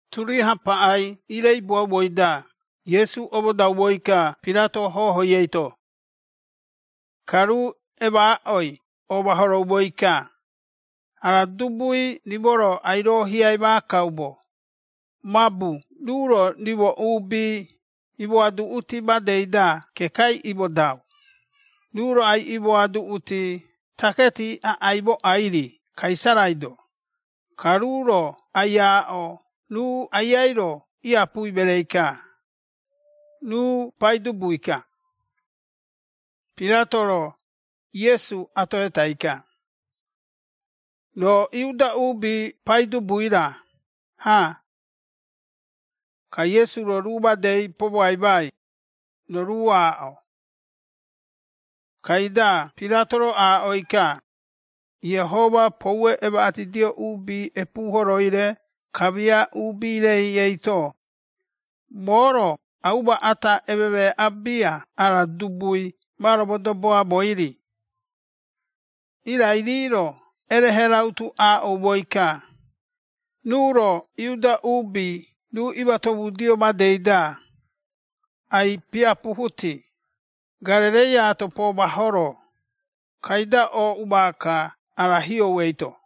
Turiaha paꞌai iireibuaumoi-da Iesu omodaumoi-ka Pirato hohoi eito. Ka ruu emaaꞌoi omahoroumoi-ka, “Ara dubui rimo-ro ai-roohiai maakaumo, mabu ruu-ro rimo uubi imoaduꞌuti madei-da kekai imodau, ruu-ro ai-imoaduꞌuti taketi aꞌai mooꞌai-ri Kaisarai-do, ka ruu-ro ai-aaꞌo ruu Aiai-ro iapui mereei-ka, ruu Paidubui-ka.” Pirato-ro Iesu atohetai-ka, “Roo Iuda uubi Paidubui-ra, ha?” Ka Iesu-ro ruu madei pomoaimai, “Roo ruu aaꞌo.” Kaida Pirato-ro aaꞌoi-ka, Iehoma poue emaꞌatidio uubi epuuhoroi-re kamia uubi-rei eito, “Moo-ro auma ata ememeeꞌa bia ara dubui ma romodoboamoi-ri.” Irai rii-ro erehe rautu aaꞌoumoi-ka, “Ruu-ro Iudea uubi ruu imatomudio madei-da, ai-piapuhuti, Garereiaato pomahoro, kaida ooꞌu maaka ara hiou eito.”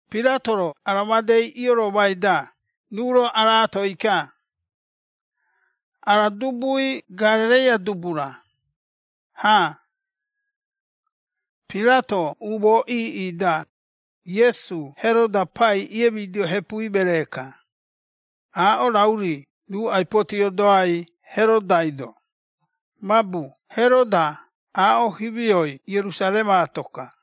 Pirato-ro ara madei ioromai-da ruu-ro araatoi-ka, “Ara dubui Garereia dubu-ra, ha?” Pirato umoo iiꞌi-da, Iesu Heroda Pai iiemidio hepui meree-ka, aaꞌo rau-ri ruu ai-potiodoai Herodai-do, mabu Heroda aaꞌo himioi Ierusaremaato-ka.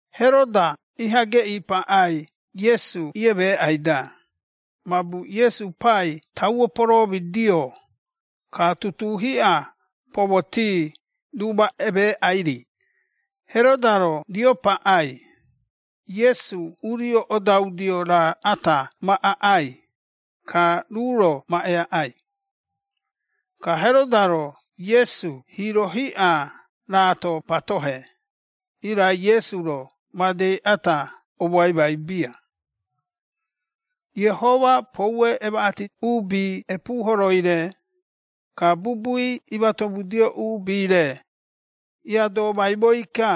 Heroda iha geꞌii paꞌai Iesu iemeeꞌai-da, mabu Iesu pai tauo poromidio, ka tutuu hiꞌa pomoti ruu ma emeeꞌai-ri, Heroda-ro rio paꞌai, Iesu urio odaudio raa ata ma aꞌai, ka ruu-ro ma eaꞌai. Ka Heroda-ro Iesu hiiro hiꞌa raato patohe, irai Iesu-ro madei ata omoaimai bia. Iehoma poue emaꞌati uubi epuuhoroi-re, ka bubui imatomudio uubi-re, iiadomaimoi-ka,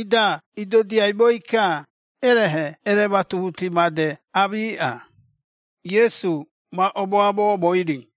ida idodiaimoi-ka erehe erematuhuti made aamiꞌa, Iesu ma omoamomoi-ri.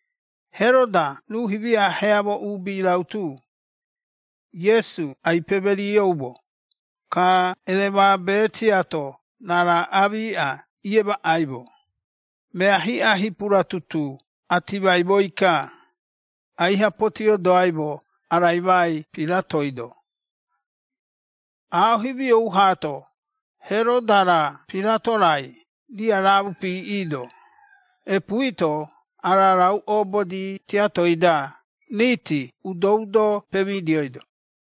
Heroda ruu himia heamo uubi rautu, Iesu ai-pemerioumo, ka eremabe tiato raara aamiꞌa iemaꞌaimo, mea hiꞌa hipura tutuu atimaimoi-ka, aiha potiodoaimo araimai Piratoi-do. Aaꞌo himiou haato, Heroda-ra Pirato-rai riaraamu piiꞌiido, epuui-to ara rau obodi tiatoi-da riiti udo-udo pemidioido.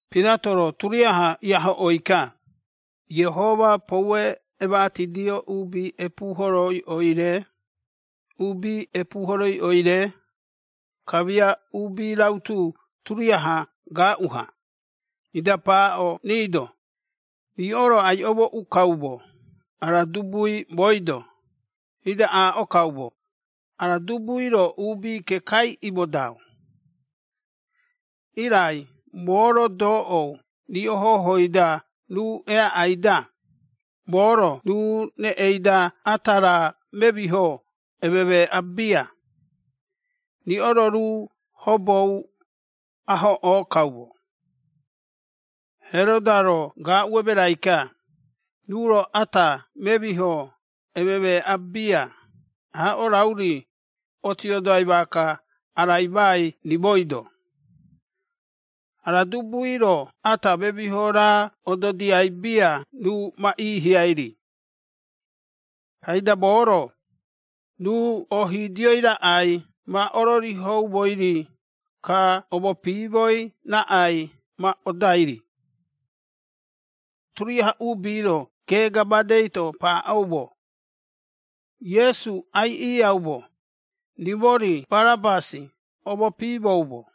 Pirato-ro turiaha iahoꞌoi-ka, Iehoma poue emaꞌatidio uubi epuuhoroiꞌoi-re, uubi epuuhoroiꞌoi-re, kamia uubi rautu turiaha gaaꞌu-ha, ida paaꞌo rii-do, “Riꞌo-ro ai-omooꞌu kaumo ara dubui mooi-do, ida aaꞌo kaumo, ara dubui-ro uubi kekai imodau. Irai moo-ro doꞌou riꞌo hohoi-da ruu eaꞌai-da, moo-ro ruu reꞌei-da ata raa memiho ememeeꞌa bia, riꞌo-ro ruu hobou ahoꞌoo kaumo. Heroda-ro gaaꞌu emerai-ka, ruu-ro ata memiho ememeeꞌa bia, aaꞌo rauri otiodoai maaka araimai rimoi-do. Ara dubui-ro ata memiho raa ododiai bia ruu ma iihiai-ri. Kaida moo-ro, ruu oohiidioi raꞌai ma ororihoumoi-ri, ka omopiimoi raꞌai ma odai-ri.” Turiaha uubi-ro geega madei-to paaꞌoumo, “Iesu aiꞌiiaumo, rimo-ri Barabasi omopiimoumo.”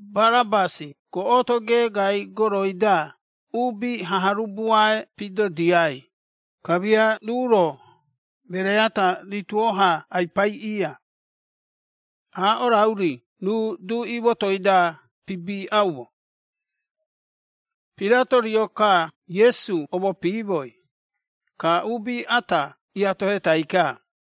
(Barabasi goꞌoto geegai goroi-da uubi haharubuae pidodiai, kamia ruu-ro meree ata rituo-ha ai-paiꞌiia, aaꞌo rau-ri ruu duꞌi motoi-da pibiꞌaumo.) Pirato rio-ka Iesu omopiimoi, ka uubi ata iatohetai-ka.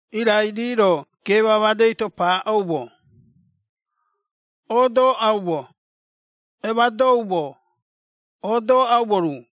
Irai rii-ro geema madei-to paaꞌoumo, “Odoꞌaumo! Emadoumo! Odoꞌaumo ruu!”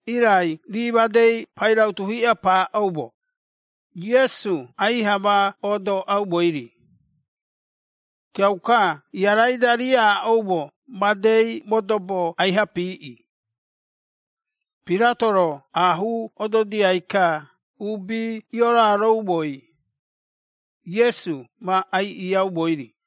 Irai rii madei pairautu hiꞌa paaꞌoumo, Iesu aiha ma odoꞌaumoi-ri. Kiauka iarai-da rii iaaꞌoumo madei modobo aiha piiꞌi. Pirato-ro aahuu ododia-ka uubi ioroaroumoi, Iesu ma aiꞌiaumoi-ri.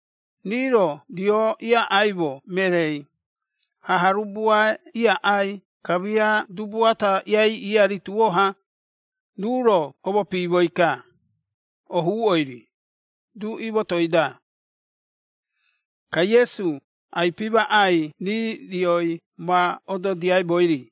Rii-ro rio iaꞌaimo mereei, haharubuae iaꞌai kamia dubu ata iaiꞌiia rituo-ha, ruu-ro omopiimoi-ka, ohuuꞌoi-ri, duꞌi motoi-da. Ka Iesu ai-pimaꞌai rii rioi ma ododiaimoi-ri.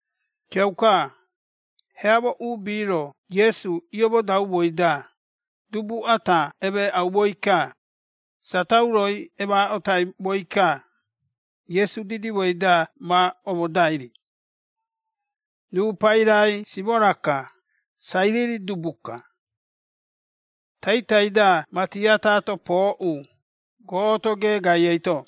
Kiauka, heamo uubi-ro Iesu iomodaumoi-da, dubu ata emeeꞌaumoi-ka, satauroi emaaꞌotaimoi-ka, Iesu didimoi-da ma omodai-ri. Ruu pairai Simora-ka, Sairiri dubu-ka. Taitai-da mati ataato pooꞌu, goꞌoto geegai eito.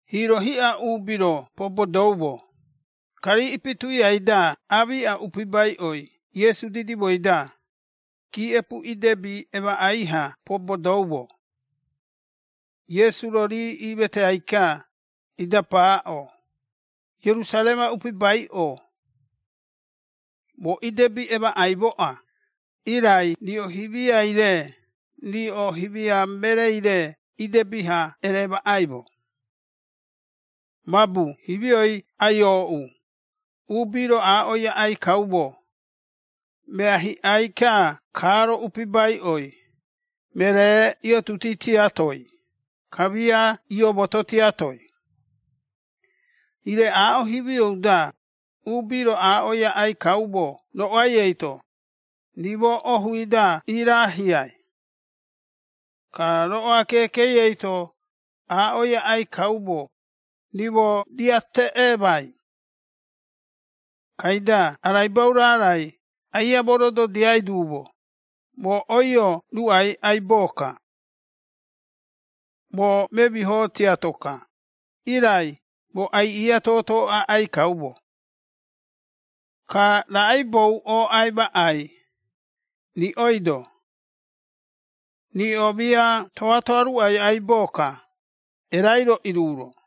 Hiiro hiꞌa uubi-ro pobodoumo, ka rii ipi tuiai-da aamiꞌa upibaiꞌoi Iesu didimoi-da, giiꞌepu idebi emaꞌai-ha pobodoumo. Iesu-ro rii iimeteai-ka, ida paaꞌo, “Ierusarema upibaiꞌo! Moo idebi emaꞌaimoꞌa, irai riꞌo himiai-re riꞌo himia mereei-re idebi-ha eremaꞌaimo. Mabu himioi ai-ooꞌu, uubi-ro aaꞌoi aꞌai kaumo, ‘Mea hiꞌai-ka kaaro upibaiꞌoi, meree iotuti tiatoi, kamia iomoto tiatoi!’ Ire aaꞌo himiou-da, uubi-ro aaꞌoi aꞌai kaumo roꞌoai eito, ‘Rimo ohui-da irahiai!’ ka roꞌoa keekei eito aaꞌoi aꞌai kaumo, ‘Rimo riiateꞌemai!’ Kaida araibau raarai aia morododiai duumo, moo oio ruꞌai aibo-ka. Moo memiho tiato-ka, irai moo aiꞌia toto aꞌai kaumo. Ka raꞌaibou ooꞌai maꞌai, riꞌoi-do? Riꞌo mia toatoa ruꞌai aibo-ka, erai-ro iruro.”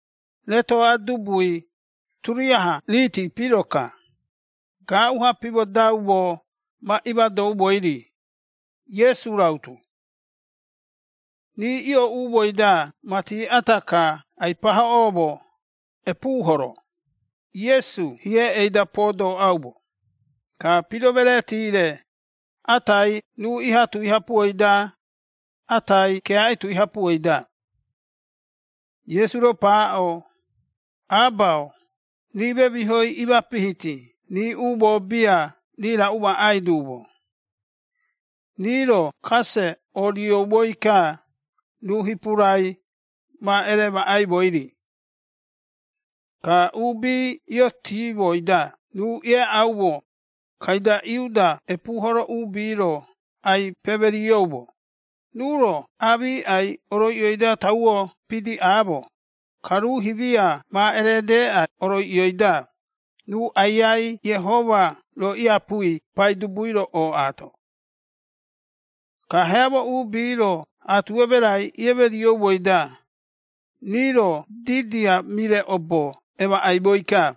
Retoꞌa dubui, turiaha riiti piro-ka, gaaꞌu-ha pimodaumo, ma imadoumoi-ri, Iesu rautu. Rii iooꞌumoi-da mati ata-ka ai-pahoꞌoumo “epuu horo”, Iesu hiei-da podoꞌaumo, ka piro mereeti-re, atai ruu iha tui hapuoi-da, atai keaꞌi tui hapuoi-da. Iesu-ro paaꞌo, “Aba-o, rii memihoi imapihiti! Rii umoo bia rii raꞌu maꞌai duumo.” Rii-ro kase orioumoi-ka, ruu hipurai, ma eremaꞌaimoi-ri. Ka uubi iotimoi-da ruu ieaꞌaumo, kaida Iuda epuuhoro uubi-ro ai-pemerioumo, “Ruu-ro aamiꞌai oroiꞌioi-da tauo pidiꞌaamo, ka ruu himia ma eredeꞌa oroiꞌioi-da, ruu Aiai Iehoma-ro iapui Paidubui-ro ooꞌaato!” Ka heamo uubi-ro aatu emerai iemerioumoi-da, rii-ro didia mire obo emaꞌaimoi-ka.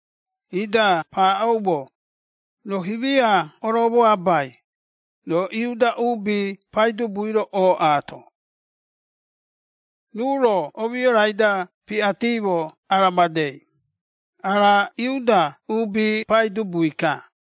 Ida paaꞌoumo, “Roo himia oromoabai, roo Iuda uubi Paidubui-ro ooꞌaato!” Ruu-ro omiorai-da piꞌatimo ara madei, “Ara Iuda uubi Paidubui-ka.”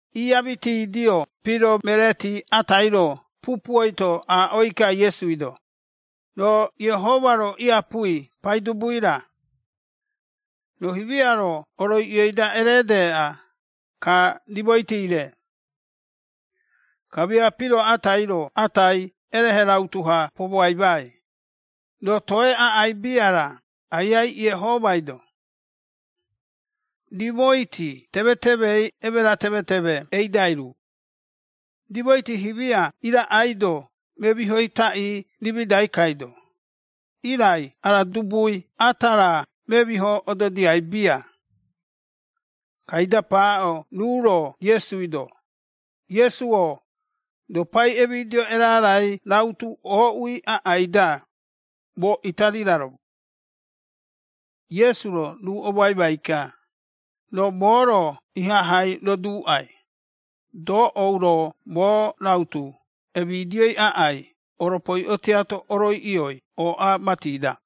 Iamitidio piro mereeti atai-ro pupuoi-to aaꞌoi-ka Iesui-do, “Roo Iehoma-ro iapui Paidubui-ra? Roo himia-ro oroiꞌioi-da eredeꞌa, ka rimoiti-re.” Kamia piro atai-ro atai erehe rautu-ha pomoaimai, “Roo toe aꞌai bia-ra Aiai Iehomai-do? Rimoiti temetemei emera temeteme eidai ruu. Rimoiti himia iraꞌaido memihoi taꞌii rimidai kaido, irai ara dubui ata raa memiho ododiai bia.” Kaida paaꞌo ruu-ro Iesui-do, “Iesu-o, roo pai emidio erarai rautu ooꞌui aꞌai-da, moo ita riraromo!” Iesu-ro ruu omoaimai-ka, “Roo moo-ro ihahai roduuꞌai, doꞌou roo moo rautu emidioi aꞌai oropoiꞌo tiato oroiꞌio ooꞌa mati-da.”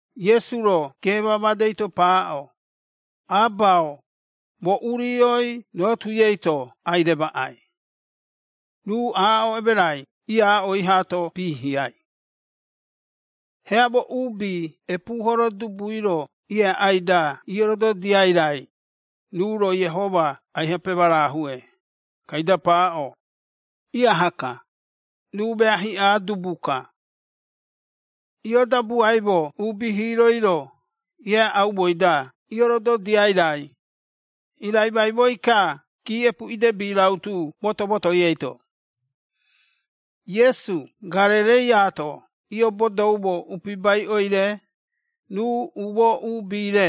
Iesu-ro geema madei-to paaꞌo, “Aba-o, moo urioi roo tui eito ai-remaꞌai.” Ruu aaꞌo emerai iaaꞌoi haato piihiai. Heamo uubi epuuhoro dubui-ro ieaꞌai-da iorododiai raai, ruu-ro Iehoma aiha pemarahue, kaida paaꞌo, “Iaha-ka, ruu mea hiꞌa dubu-ka.” Ioodabuaimo uubi hiiroi-ro, ieaꞌaumoi-da iorododiai raai, iiraimaimoi-ka giiꞌepu idebi rautu moto-motoi eito. Iesu Garereiaato iobodoumo upibaiꞌoi-re, ruu umoo uubi-re,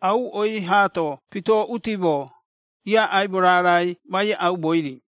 auꞌoi haato pitoꞌutimo, iaꞌaimo raarai ma iaꞌaumoi-ri.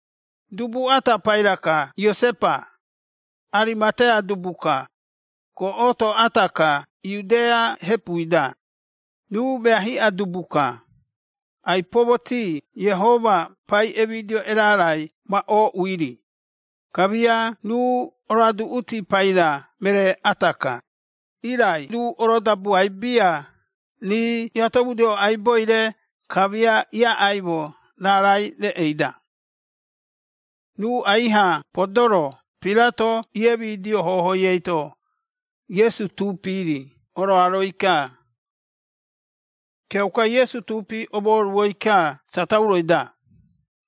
Dubu ata paira-ka Iosepa, Arimatea dubu-ka, goꞌoto ata-ka Iudea hepui-da. Ruu mea hiꞌa dubu-ka, ai-pomoti Iehoma pai emidio erarai ma ooꞌui-ri, kamia ruu oroaduꞌuti paira meree ata-ka, irai ruu orodabuai bia rii iatomudioumo aiboi-re, kamia iaꞌaimo raarai-reꞌei-da. Ruu aiha podoro Pirato iemidio hohoi eito, Iesu tuupi-ri oroaroi-ka. Kiauka Iesu tuupi omoruoi-ka satauroi-da,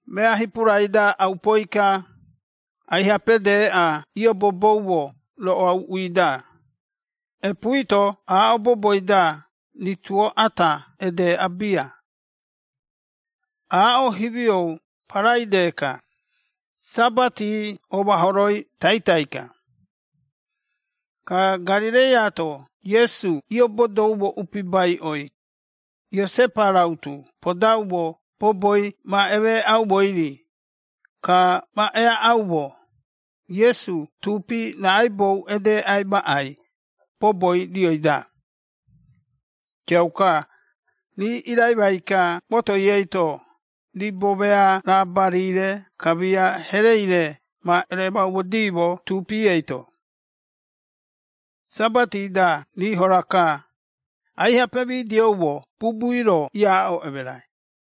mea hipurai-da aupoi-ka, aiha pedeꞌa ioboboumo roꞌoa uuꞌui-da, epuui-to aaꞌo boboi-da rituo ata edeꞌa bia. Aaꞌo himiou Paraide-ka, Sabati omahoroi taitai-ka. Ka Garereiaato Iesu iobodoumo upibaiꞌoi, Iosepa rautu podaumo boboi ma emeeꞌaumoi-ri, ka ma eaꞌaumo, Iesu tuupi raꞌaibou edeꞌai maꞌai, boboi rioi-da. Kiauka, rii iraimai-ka motoi eito, ribo mea raabari-re kamia herei-re ma eremaumodiimo tuupi eito. Sabati-da rii hora-ka, aiha pemidioumo bubui-ro iaaꞌo emerai.